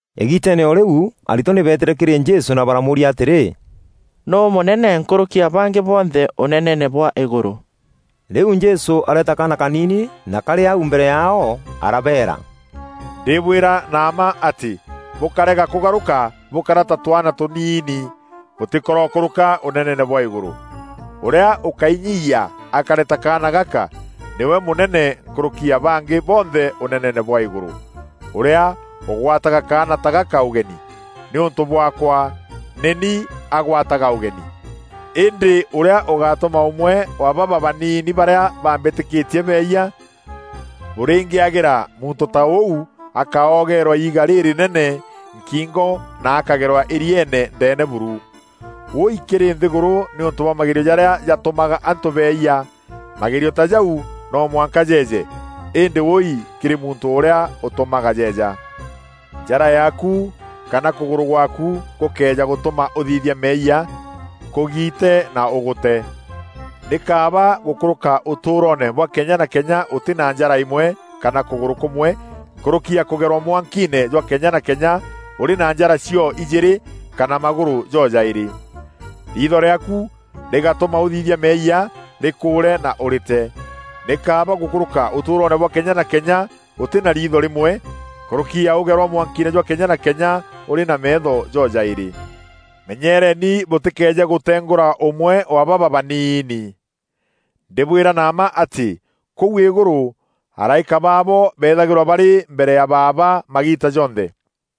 Îgiiteene o rîu aritwa nî beetîre kîrî Jesû na baramûûria atîrî, “Nûû mûnene nkûrûki ya bangî bonthe Ûneneene bwa îgûrû?” Rîu Jesû areeta kaana kaniini na karî au mbere yaao, arabeera, “Ndîbwîra na mma atî bûkarega kûgarûka bûkara ta twaana tûniini, bûtîkorokûrûka Ûneneene bwa îgûrû. Ûrîa ûkainyiiyia akare ta kaana gaka, nîwe mûnene nkûrûki ya bangî bonthe Ûneneene bwa îgûrû. Ûrîa ûgwataga kaana ta gaka ûgeni, nîûntû bwaakwa, nî ni agwataga ûgeni.” “Îndî ûrîa ûgatûma ûmwe wa baba baanini barîa bambîtîkîtie beeyia, bûrîngîagîra muntû ta ûu akaogeerwa iiga rîrînene nkingo na akagerwa îrieene ndeene buru. Wûi kîrî nthîgûrû nîûntû bwa magerio jarîa jatûmaga antû beeyia! Magerio ta jau no mwanka jeeje, îndî wûi kîrî muntû ûrîa ûtûmaga jeeja! Njara yaaku kana kûgûrû gwaaku gûkëeja gûtûma ûthithia meeyia, kûgiite na ûgûte. Nî kaaba gûkûrûka ûtûûroone bwa kenya na kenya ûtî na njara îmwe kana kûgûrû kûmwe nkûrûki ya kûgerwa mwankiine jwa kenya na kenya ûrî na njara cio-ijîîrî kana magûrû jo-jaîrî. Riitho rîaaku rîgatûma ûthithia meeyia, rîkûûre na ûrîte. Nî kaaba gûkûrûka ûtûûroone bwa kenya na kenya ûtî na riitho rîmwe, nkûrûki ya ûgerwa mwankiine jwa kenya na kenya ûrî na meetho jo-jaîrî.” “Menyeereeni bûtîkeeje gûtengûra ûmwe wa baba baniini. Ndîbwîra na mma atî kûu îgûrû araîka baabo beethagîrwa barî mbere ya Baaba magiita jonthe. [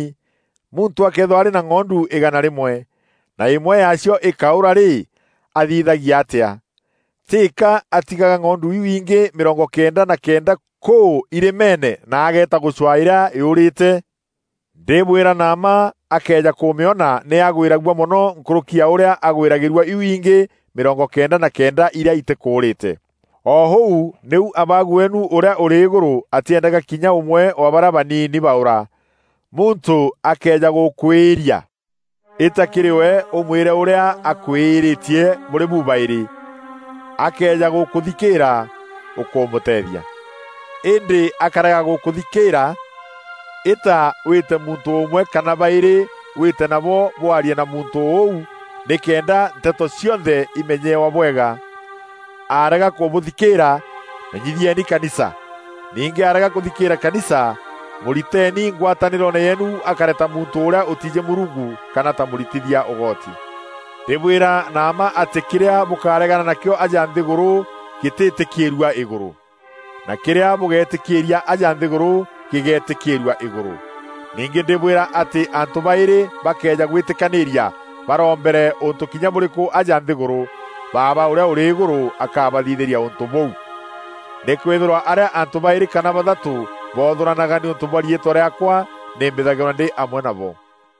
Û mbîreeni! Muntû akëethîrwa arî na ng'ondu îgana rîmwe, na îmwe yaacio îkaûra rî, athithagia atîa? Tîka atigaga ng'ondu iu ingî mîrongo kenda na kenda kûû irîmeene na ageeta gûcwaa îrîa yûûrîte? Ndîbwîra na mma akëeja kûmîona nî agwîragua mono nkûrûki ya ûrîa agwîragîrua iu ingî mîrongo kenda na kenda irîa itîkûûrîte. O ûu nîu Abaagu weenu ûrîa ûrî îgûrû atîendaga kinya ûmwe wa barîa baniini baûra.” “Muntû akëeja gûkwîîria, îta kîrî we ûmwîre ûrîa akwîîrîtie bûrî bu-baîrî. Akëeja gûkûthikîîra, ûkûmûteethia. Îndî akarega gûkûthikîra, îta wîte muntû ûmwe kana baîrî wîte nabo bwarie na muntû ûu nîkenda nteto cionthe imenyewa bwega. Arega kûbûthikîîra, menyithieni kanisa. Ningî arega kûthikîîra kanisa, mûriteeni ngwatanîroone yeenu akare ta muntû ûrîa ûtiijî Mûrungu kana ta mûritithia ûgoti. “Ndîbwîra na mma atî kîrîa bûkaregana nakîo aja nthîgûrû gîtîtîkîîrua îgûrû, na kîrîa bûgetîkîîria aja nthîgûrû gîgetîkîîrua îgûrû. Ningî ndîbwîra atî antû baîrî bakëeja gwîtîkanîîria barombere ûntû kinya bûrîkû aja nthîgûrû, Baaba ûrîa ûrî îgûrû akabathithîria ûntû bûu. Nîkwîthîrwa arîa antû baîrî kana bathatû boothûranaga nîûntû bwa riîtwa rîaakwa nî mbîthagîrwa ndî amwe nabo.”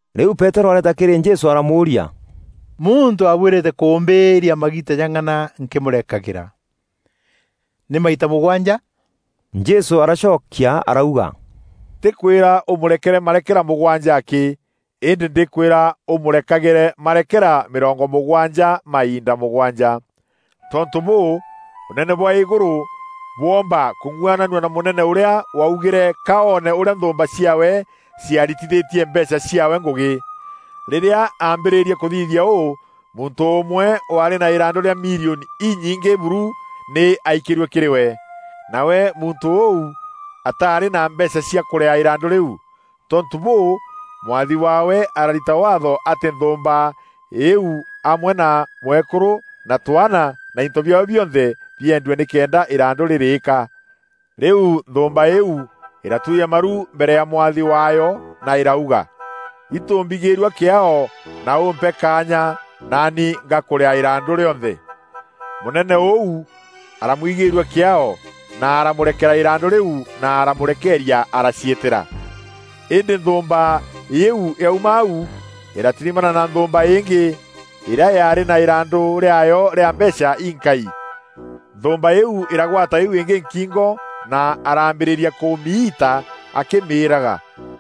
Rîu Peterû areeta kîrî Jesû aramûûria, “Muntû abuîrîte kûmbîîria magiita jang'ana nkîmûrekagîra? Nî maita mûgwanja?” Jesû aracokia arauga, “Ntîkwîra ûmûrekere marekera mûgwanja akî, îndî ndîkwîra ûmûrekagîre marekera mîrongo mûgwanja mainda mûgwanja. “Tontû bûû, Ûnene bwa îgûrû bwoomba kung'uananua na mûnene ûrîa waugîre ka oone ûrîa nthûûmba ciaawe ciaritîthîtie mbeecha ciaawe ngûgî. Rîrîa ambîrîrie kûthithia ûû muntû ûmwe waarî na îrandû rîa milioni inyingî buru nî aikîrue kîrî we. Nawe muntû ûu ataarî na mbeecha cia kûrîaa îrandû rîu. Tontû bûû, mwathi waawe ararita Waatho atî nthûûmba îîu amwe na mwekûrû na twaana na into biaawe bionthe biendue nîkenda îrandû rîrîîka. Rîu nthûûmba îîu îratûria maru mbere ya mwathi waayo na irauga, ‘Itû mbigîîrua kîaao na ûmpe kaanya, naani ngakûrîaa îrandû rîonthe.’ Mûnene ûu aramwigîîrua kîaao na aramûrekera îrandû rîu na aramûrekeeria araciîtîra. Îndî nthûûmba îîu yauma au, îratirimana na nthûûmba îngî, îrîa yaarî na îrandû rîaayo rîa mbeecha inkai. Nthûûmba îîu îragwata îîu îngî nkingo na arambîrîria kûmiita akîmîîraga,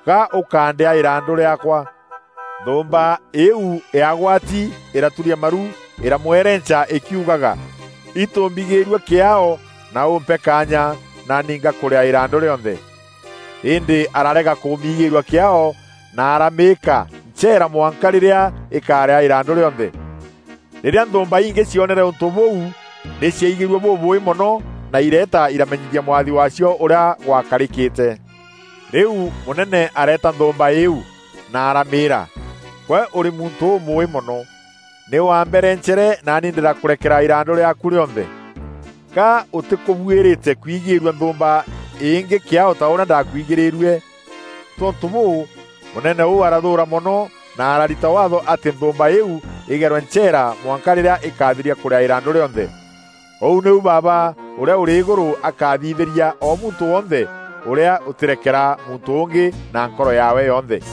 ‘Ga ûkandîaa îrandû rîaakwa!’ Nthûûmba îîu yaagwati îraturia maru îramwerenca îkiugaga, ‘Itû mbigîîrua kîaao na ûmpe kaanya, naani ngakûrîaa îrandû rîonthe.’ Îndî ararega kûmiigîîrua kîaao na aramîîka ncheera mwanka rîrîa îkarîa îrandû rîonthe. Rîrîa nthûûmba ingî cionere ûntû bûu nî ciaigîrue bûbûûî mono na ireeta iramenyithia mwathi waacio ûrîa gwakarîkîte. Rîu mûnene areeta nthûûmba îîu, na aramîîra, ‘Gwe ûrî muntû ûmûûî mono! Nî waamberencere, naani ndîrakûrekera îrandû rîaaku rîonthe. Ga ûtîkûbuîrîte kwigîrua nthûûmba îngî kîaao ta ûrîa ndakwigîîrue?’ Tontû bûû, mûnene ûu arathûûra mono, na ararita Waatho atî nthûûmba îîu îgerwe ncheera mwanka rîrîa îkathiria kûrîaa îrandû rîonthe. Ûu nîu Baaba ûrîa ûrî îgûrû akathithîria o muntû wonthe ûrîa ûtîrekera muntû ûngî na nkoro yaawe yonthe.”